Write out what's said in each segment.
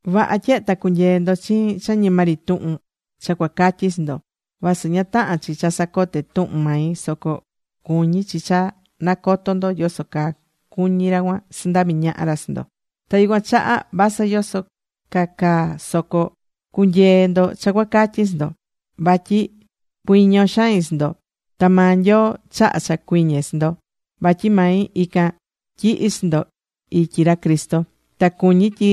Vaha tyehe ta cunyeé ndo chiin cha ñima ri tuhun cha cuacatyi chi ndo. (Vasɨ ña tahán chi cha sacoté tuhun mai, soco cuñí chi cha nacotó ndo yoso caa cuñí ra cuan sandaví ñaha ra chi ndo.) Ta yucuan chaha vasɨ yoso ca caa soco cu̱nyee ndo cha cuacatyi chi ndo. Vatyi cuiñó xain chi ndo. Ta maa Nyoo chahá cha cuiñe chi ndo, vatyi mai ican tyihi̱ chi ndo ityi ra Cristo. Ta cuñí tyi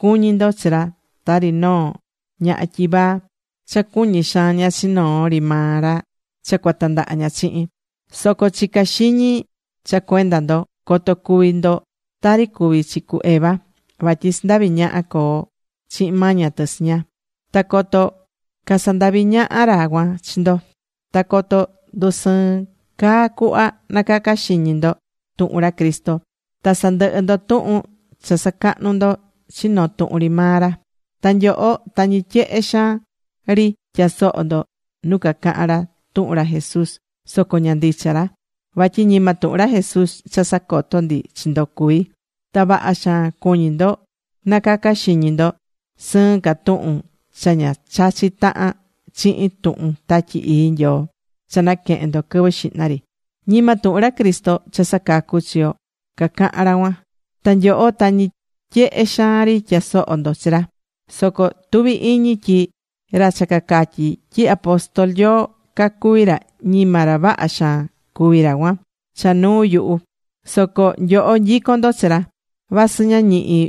cuñí ndo chi ra tari noo ñaha tyivaa cha cuñí xaan ña chi noo ri maa ra cha cuatandaha ña chihin. Soco chicá xiñi cha cuenda ndo, coto cuvi chi ndo tari cuvi̱ chi cu Eva. Vatyi sandavi̱ ñaha coo chihin maña tɨ chi ña. Ta coto casandaví ñaha ra cuan chi ndo. Ta coto ndusɨɨn caa cuhva nacacá xiñi ndo tuhun ra Cristo. Ta sandɨhɨ ndo tuhun cha sacahnú ndo chi noo tuhun ri maa ra. Ta nyoho tañi tyehe xaan ri tyasohó ndo nu cacahán ra tuhun ra Jesús soco ña ndicha ra. Vatyi ñima tuhun ra Jesús cha sacotó ndi chi ndo cuví. Ta vaha xaan cuñí ndo nacacá xiñi ndo sɨɨn ca tuhun cha ña chachí tahan chihin tuhun Tatyi Ii Nyoo cha naquehe̱n ndo quɨvɨ xihna ri. Ñima tuhun ra Cristo cha sacacú chi yo cacahán ra cuan. Ta nyoho tañi tyehe xaan ri tyasohó ndo chi ra. Soco tuví iñi tyi ra cha cacatyí tyi apóstol Nyoo cacuví ra, ñima ra vaha xaan cuví ra cuan cha nuu yuhu. Soco nyoho, nyicón ndo chi ra. Vasɨ ña ñihí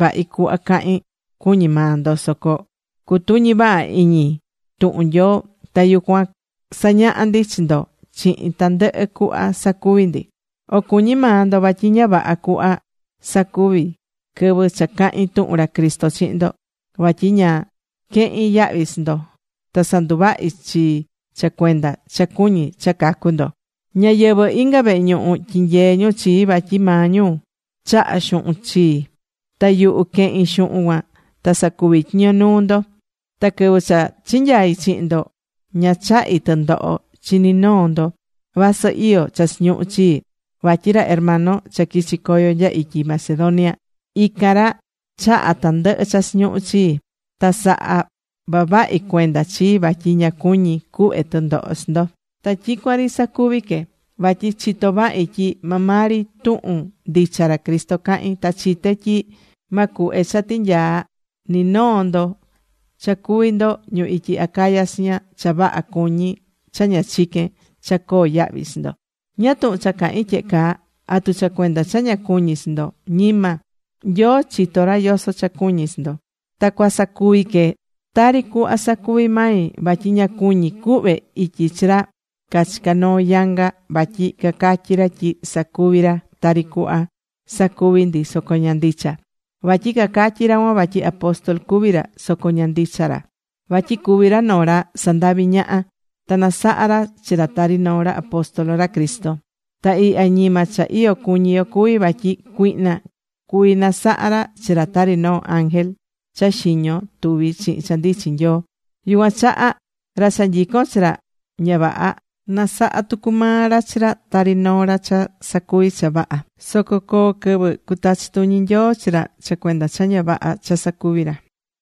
vahi cuhva cahín, cuñí maa ndo. Soco cutuñí vaha iñi tuhun Nyoo. Ta yucuan sañahá ndi chi ndo chihin tandɨhɨ cuhva sacuví ndi. O cuñí maa ndo vatyi ña vaha cuhva sacuvi̱ quɨvɨ cha cahi̱n tuhun ra Cristo chihin ndo. Vatyi ña quehi̱n yahvi chi ndo. Ta sandundahvi̱ chii cha cuenda cha cuñí cha cacu ndo. Ñáyɨvɨ inga vehe ñuhu tyinyee̱ ñu chii. Vatyi maa ñu chaha̱ xuhun chii. Ta yuhu quehi̱n xuhun cuan ta sacuví tyiño nuu ndo. Ta quɨvɨ cha chinyai̱ chihin ndo ña chahi̱ tɨndoho chi ni noo ndo vasɨ iyó cha chiñuhu̱ chii. Vatyi ra hermano cha quichi coyo nya ityi Macedonia, ican ra chaha̱ tandɨhɨ cha chiñuhu̱ chii. Ta saha̱ vavahi cuenda chii vatyi ña cuñi̱ cuhve tɨndoho chi ndo. Ta tyicuan ri sacuvi que. Vatyi chitó vahi tyi maa maa ri tuhun ndicha ra Cristo cahín, ta chité tyi ma cuhve cha tinyaa ni noo ndo, cha cuví ndo ñu ityi Acaya chiña, cha vaha cuñí cha ña chiquén cha coo yahvi chi ndo. ¿Ñáá tuhun cha cahín tyehe caa? ¿Atu cha cuenda cha ña cuñí chi ndo? Ñima. Nyoo chitó ra yoso cha cuñí chi ndo. Ta cuasacuvi que tari cuhva sacuví mai. Vatyi ña cuñí cuhve ityi chi ra cachicá noo yanga vatyi cacatyí ra tyi sacuví ra tari cuhva sacuví ndi soco ña ndicha. Vatyi cacatyí ra cuan vatyi apóstol cuví ra. Soco ña ndicha ra. Vatyi cuví ra noo ra sandaví ñaha ta nasahá ra chi ra tari noo ra apóstol ra Cristo. Ta ihya ñima cha iyo cuñí yo cuví. Vatyi cuihna cuví nasaha ra chi ra tari noo ángel cha xiño tuví chihin cha ndichin Nyoo. Yucuan chaha ra cha nyicón chi ra ña vaha, nasahá tucu maa ra chi ra tari noo ra cha sacuví cha vaha. Soco coo quɨvɨ cutachi tuñi Nyoo chi ra cha cuenda cha ña vaha cha sacuví ra.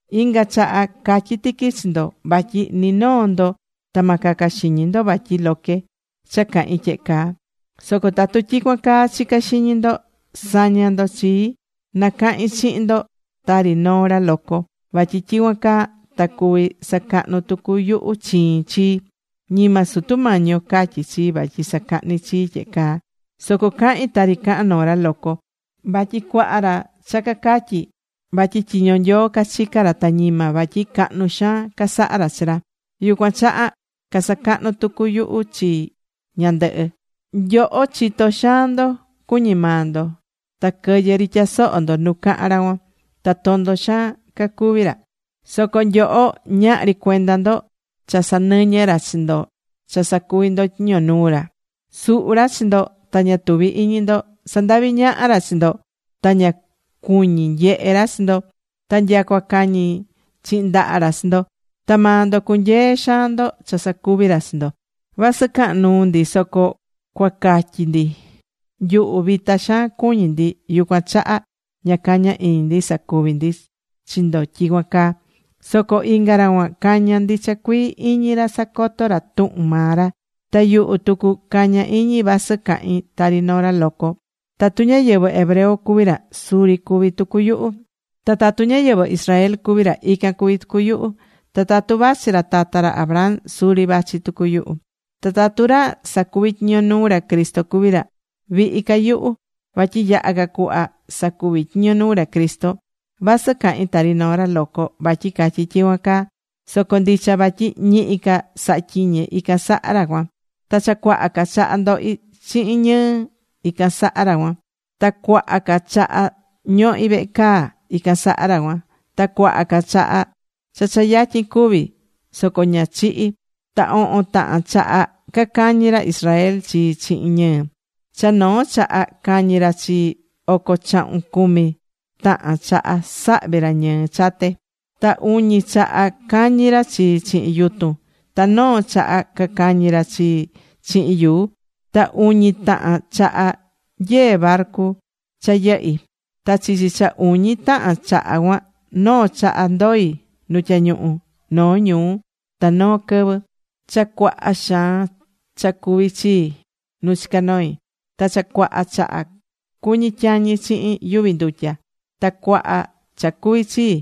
Inga chaha catyí tiqui chi ndo vatyi ni noo ndo ta ma caca xiñi ndo vatyi loque cha cahín tyehe caa. Soco tatu tyicuan caa chicá xiñi ndo, sa̱ña ndo chii na cahin chihin ndo tari noo ra loco. Vatyi tyicuan caa ta cuví sacahnu tucu yuhu chiin chii. Ñima Sutu Mañi yo catyí chii vatyi sacahni chii tyehe caa. Soco cahín tari cahán noo ra loco. Vatyi cuaha ra cha cacatyí vatyi tyiño Nyoo cachicá ra, ta ñima, vatyi cahnu xaan casahá ra chi ra. Yucuan chaha cusacahnu tucu yuhu chii ñandɨhɨ. Nyoho, chitó xaan ndo, cuñí maa ndo. Ta quɨyɨ ri tyasohó ndo nu cahán ra cuan. Ta tondo xaan cacuví ra. Soco nyoho ñahri cuenda ndo cha sanɨñɨ́ ra chi ndo cha sacuví ndo tyiño nuu ra. Suhú ra chi ndo ta ña tuví iñi ndo. Sandaví ñaha ra chi ndo. Ta ña cuñí nyehe ra chi ndo. Ta nyacua cañí chihin ndaha ra chi ndo. Ta maa ndo cunyeé xaan ndo cha sacuví ra chi ndo. Vasɨ cahán nuu ndi soco cua catyi ndi, nyuhu vita xaan cuñí ndi yucuan chaha ña cañá iñi ndi sacuví ndi chi ndo tyicuan caa. Soco inga ra cuan cañá ndicha cuii iñi ra sacotó ra tuhun maa ra. Ta yuhu tucu cañá iñi vasɨ cahín tari noo ra loco. Tatu ñáyɨvɨ hebreo cuví ra, suri cuví tucu yuhu. Ta tatu ñáyɨvɨ Israel cuví ra, ican cuví tucu yuhu. Ta tatu vachí ra tata ra Abraham, suri vachi tucu yuhu. Ta tatu ra sacuví tyiño nuu ra Cristo cuví ra, vihi ca yuhu. Vatyi yaha ca cuhva sacuví tyiño nuu ra Cristo. Vasɨ cahín tari noo ra loco vatyi catyí tyicuan caa. Soco ndicha. Vatyi ñihi ca sahá tyiñe ican saha ra cuan. Ta cha cuaha ca chaha ndohi̱ chihin ñɨɨ ican saha ra cuan. Ta cuaha ca chaha ñohi̱ vehe caa ican saha ra cuan. Ta cuaha chaha cha cha yatyin cúvi, soco ña chihi̱. Ta ohon tahan chaha cacañi̱ ra Israel chii chihin ñɨɨ. Cha noo chaha cañi̱ ra chii, oco chahun cumi tahan chaha sahvi̱ ra ñɨɨ chate. Ta uñi chaha cañi̱ ra chii chihin yutun. Ta noo chaha cacañi̱ ra chii chihin yuu. Ta uñi tahan chaha nyee̱ barcu cha yɨhí. Ta chichi cha uñi tahan chaha cuan, noo chaha ndoi̱ nu tyañuhu noo ñuu ta noo quɨvɨ. Cha cuaha xaan cha cuvi̱ chii nu chica noi. Ta cha cuaha chaha cuñi̱ tyañi chihin yuvi ndutya. Ta cuaha cha cuvi̱ chii.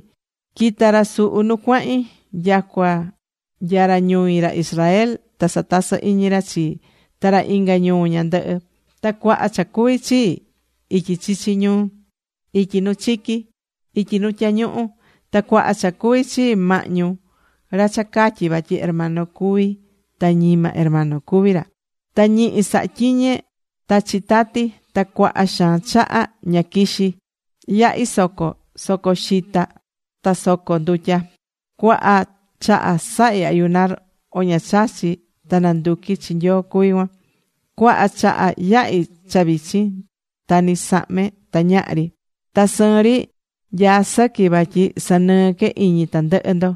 Quita̱ ra suhu nu cuahin. Nyacua nya ra ñui, ra Israel, ta satasɨ́ iñi ra chii. Ta ra inga ñuu ñandɨhɨ. Ta cuaha cha cuvi̱ chii ityi chichi ñuu, ityi nu chiqui, ityi nu tyañuhu. Ta cuaha cha cuvi̱ chii mahñu ra cha catyí vatyi hermano cuví ta ñima hermano cuví ra. Ta ñihi sahá tyiñe ta chitati. Ta cuaha xaan chaha ña quixi̱. Yahi̱ soco: soco xita ta soco ndutya. Cuaha chaha sahi̱ ayunar, o ña chachí ta nanduqui chi Nyoo cuví cuan. Cuaha chaha yahí cha vichin. Ta ni sahme ta ñahri. Ta sɨɨn ri nyaá sɨqui vatyi sanɨɨ́ que iñi tandɨhɨ ndo: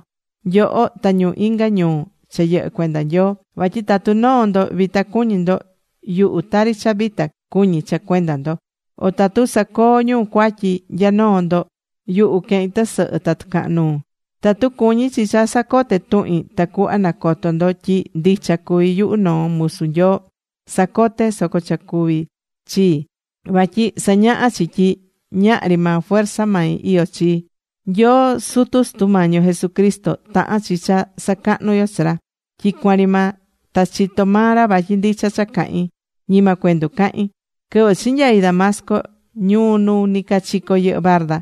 nyoho ta ñu inga ñuu cha yɨhɨ́ cuenda Nyoo. Vatyi tatu noo ndo vita cuñí ndo, yuhu tari cha vita cuñí cha cuenda ndo. O tatu sacoó ñu cuatyi nya noo ndo, yuhu quehín tɨsɨhɨ ta tɨcahan nuu. Tatu cuñí chi cha sacote tuhin tacuhva nacoto ndo tyi ndicha cuví yuhu noo musu Nyoo, cusacote soco cha cuví chii. Vatyi sañahá chi tyi ñahri maa fuerza mai iyó chii. Nyoo sutu Sutu Mañi yo Jesucristo, tahán chi cha sacahnú yo chi ra tyicuan ri maa. Ta chitó maa ra vatyi ndicha cha cahín, ñima cuendu cahín. Quɨvɨ chinyai̱ Damasco (ñuu nu nicachico yɨhɨ barda)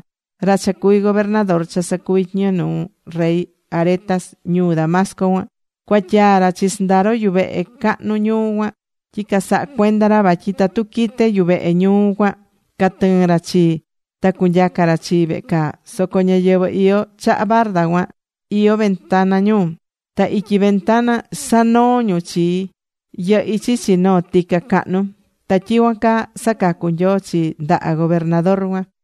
ra cha cuví gobernador cha sacuví tyiño nuu rey Aretas ñuu Damasco cuan, cuatyaa̱ ra chi sɨndaro yuvehe cahnu ñuu cuan, tyi casahá cuenda ra. Vatyi tatu quite yuvehe ñuu cuan catɨɨn ra chii ta cunyaca ra chii vehe caa. Soco ñáyɨvɨ iyó chaha barda cuan iyó ventana ñu. Ta ityi ventana sanoo̱ ñu chii. Yɨhi̱ chichi noo tica cahnu. Ta tyicuan caa sacacu̱ Nyoo chii ndaha gobernador cuan.